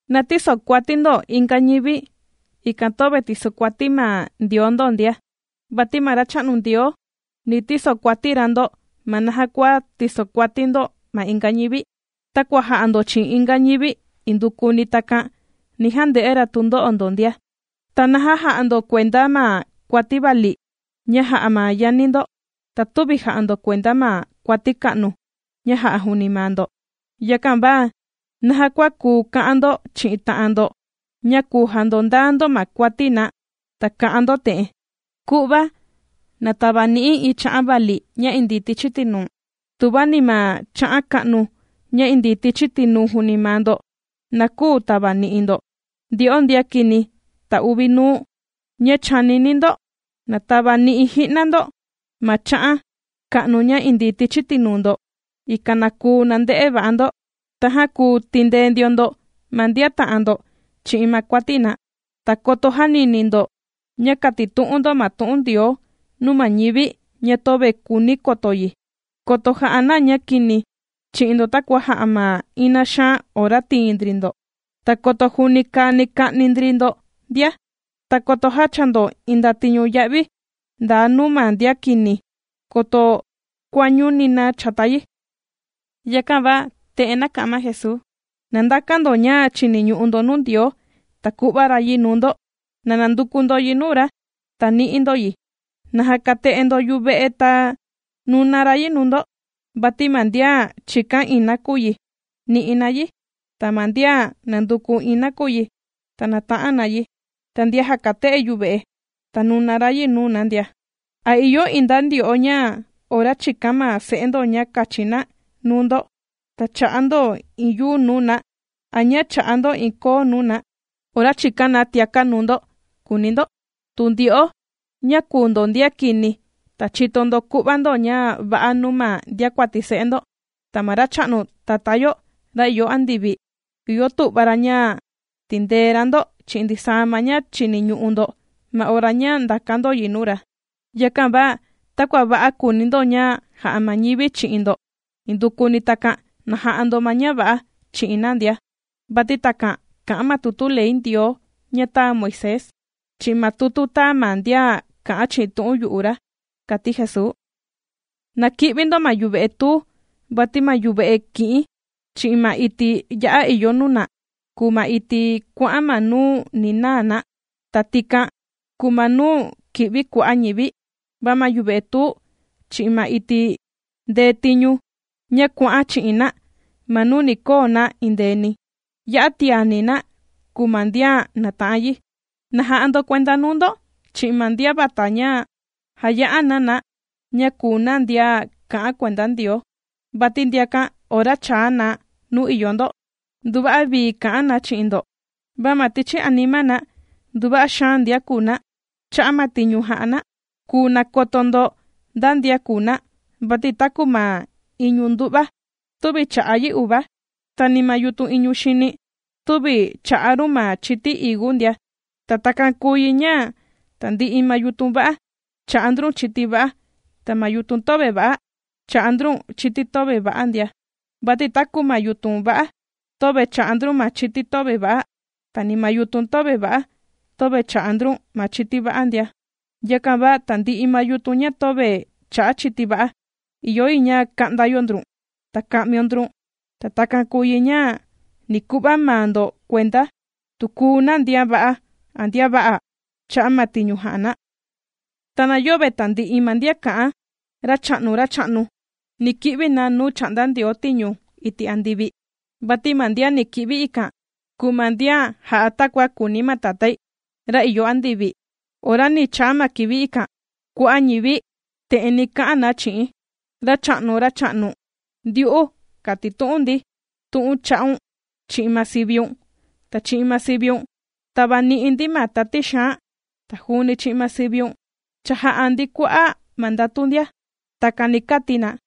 ’Na tïsokuati ndo inga ñivi, ikan töve tìsokuati ma Ndioo ndo ndia. Vati ma Racha'nu Ndioo, ni tisokuati ra ndo ma naja kua tīsokuati ndo ma inga ñivi. Takua jà'a ndo chi'in inga ñivi indukuni takan, ni jande'e ra tundo'o ndo ndia. ¿Ta naja jà'a ndo kuenda ma kuati vali, ña jà'a ma yani ndo, ta tüvi jà'a ndo kuenda ma kuati ka'nu, ña jà'a juuni maa ndo? Yakan va naja kua kùu ka'an ndo chi'in ta'an ndo ña kùu jandondaa ndo ma kuati na ta kà'an ndo te'en: “Ku'va na tavani'i̱ iin cha'an vali ña indii tichi tinuu̱n”, tuva ni ma cha'an ka'nu ña indii tichi tinuu juuni maa ndo na küu tavani'i ndo. ¡Ndyo'o ndian kini ta uvi nuu ña chànini ndo!, na tavani'i ji'na ndo ma cha'an ka'nu ña indii tichi tinuu ndo, ikan na kuu nande'e va'a ndo, tajan kuu tindee ndio ndo ma ndian ta'an ndo chi'in ma kuati na. ’Ta koto jänini ndo ña kàtitu'un ndo ma tu'un Ndioo nuu ma ñivi ña töve kùuni koto yi, koto ja'a na ña kini chi'in ndo, takua jà'a ma ina xaan ora tìin ndri ndo. Ta koto juuni kani ka'ni ndri ndo ndia. Ta koto jächaa ndo iin ndatiñu ya'vi ndaa nuu ma ndian kini, koto kuañuni na chata yi. Yakan va te'en nāka'an ma Jesuu: ―Na ndakan ndo ña chìniñu'u ndo nuu Ndioo, ta ku'va ra yi nuu ndo, na nanduku ndo yi nuu ra, ta nì'i ndo yi. Na jakate'e ndo yuve'e, ta nuna ra yi nuu ndo. Vati ma ndian chìkan iin nakuyi, nì'i na yi, ta ma ndian nànduku iin nakuyi, ta nàta'an na yi, ta ndian jàkate'e yuve'e, ta nùna ra yi nuu na ndia. ’¿A ìyo iin nda ndyo'o ña ora chìkan ma se'e ndo ña kachi na nuu ndo, ta chà'a ndo iin yuu nuu na? ¿A ña chà'a ndo iin koo nuu na, ora chìkan na tiaka' nuu ndo?, kùuni ndo. Tu ndyo'o ña kùu ndo ndian kini, ta chìto ndo ku'va ndo ña va'a nuu ma ndiakuati se'e ndo, ta ma Racha'nu Tatá yo ra ìyo andivi ìyo tu'va ra ña tindee ra ndo chi'in ndisaa ma ña chìniñu'u ndo ma ora ña chìkan ndo yi nuu ra. ’Yakan va takua va'a kùuni ndo ña ja'a ma ñivi chi'in ndo, indukuni takan na ja'a ndo ma ña va'a chi'in na ndia. Vati takan kà'an ma tutu ley Ndioo ña tāa Moisés, chi'in ma tutu ña tāa ma ndian kà'an chi'in tu'un yu'u ra ―kàti Jesuu. ’Na ki'vi ndo ma yuve'e tuu. Vati ma yuve'e ki'in chi'in ma iti' ya'a ìyo nuna, kùu ma iti' kuà'an ma nuu ni naa na, ta tikan kùu ma nuu ki'vi kua'a' ñivi. Va ma yuve'e tuu, chi'in ma iti' ndetiñu, ña kuà'an chi'in na ma nuu ni koo na endeeni, ya'a tiani na kùu ma ndian nàta'an yi. ’Na ja'a ndo kuenda nuu ndo, chi'in ma ndian vata ña jàya'a na na ña kùu na ndian kà'an kuenda Ndioo. Vati ndiakan ora chàa na nuu ìyo ndo, nduva'a vii kà'an na chi'in ndo, va ma tichi anima na nduva'a xaan ndian kùu na. Cha'a' ma tiñu jà'a na, kùu nakoto ndo nda ndian kùu na. Vati taku ma iñu ndu'va, tüvi chà'a yi uva, ta ni ma yutun iñu xini, tüvi chà'a run ma chiti higu ndia. Ta takan kùu yi ña tandi'i ma yutun va'a, chà'a ndrun chiti va'a, ta ma yutun töve va'a, chà'a ndrun chiti töve va'a ndia. Vati taku ma yutun va'a, töve chà'a ndrun ma chiti töve va'a, ta ni ma yutun töve va'a, töve chà'a ndrun ma chiti va'a ndia. Yakan va tandi'i ma yutun ña töve chà'a chiti va'a, ìyo yi ña ka'nda yo ndrun, ta ka'mio ndrun. Ta takan kùu yi ña ni ku'va maa ndo kuenda, tu kùu na ndian va'a a ndian vä'a' cha'a' ma tiñu jà'a na. ’Ta na yöve tandi'i ma ndian kà'an: “Racha'nu, Racha'nu”, ni ki'vi na nuu chà'nda Ndioo tiñu iti' andivi, vati ma ndian ni ki'vi ikan, kùu ma ndian jà'a takua kùuni ma Tatái, ra ìyo andivi. Ora ni chaa ma kivi ikan, kua'a' ñivi te'en ni ka'an na chi'i̱n: “Racha'nu, Racha'nu, ndyu'u kàtitu'un ndi tu'un cha'un chi'in ma siviun, ta chi'in ma siviun tāvani'i ndi ma tati xaan, ta juuni chi'in ma siviun cha jā'a ndi kua'a' ma ndatu ndia.” Takan ni kati na.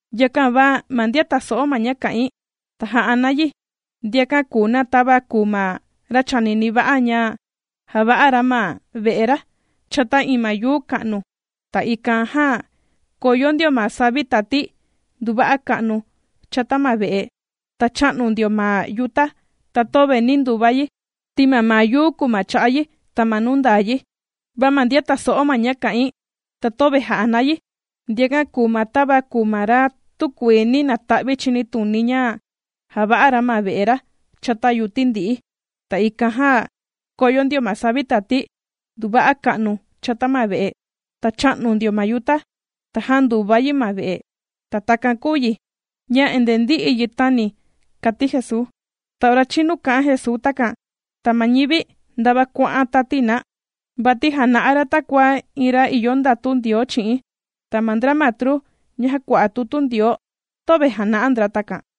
’Yakan va ma ndian tàso'o ma ña kà'in, ta jà'a na yi, ndiakan kùu na tava kùu ma ra chānini va'a, ña jāva'a ra ma ve'e ra chata iin ma yuu ka'nu. Ta ikan jan kōyo ndio ma savi tati nduva'a ka'nu chata ma ve'e, ta chā'nu ndio ma yuta, ta töve nī nduva yi, ti mamaa yuu kùu ma cha'a yi, ta ma nuu ndaa yi. Va ma ndian tàso'o ma ña kà'in, ta töve jà'a na yi, ndiakan kùu na, tava kùu ma ra tükuii nī nata'vi chinituni ña jāva'a ra ma ve'e ra chata yuti ndi'i. Ta ikan jan kōyo ndio ma savi tati nduva'a ka'nu chata ma ve'e, ta chā'nu ndio ma yuta, ta jānduva yi ma ve'e. Ta takan kūu yi ña endee ndī'i yi tāni ―kàti Jesuu. Ta ora chīnu kā'an Jesuu takan, ta ma ñivi, ndava kuà'an tati na. Vati jàna'a ra takua iin ra ìyo ndatu Ndioo chi'in, ta ma ndra matru ña jàkua'a tutu Ndioo töve jàna'a ndra takan.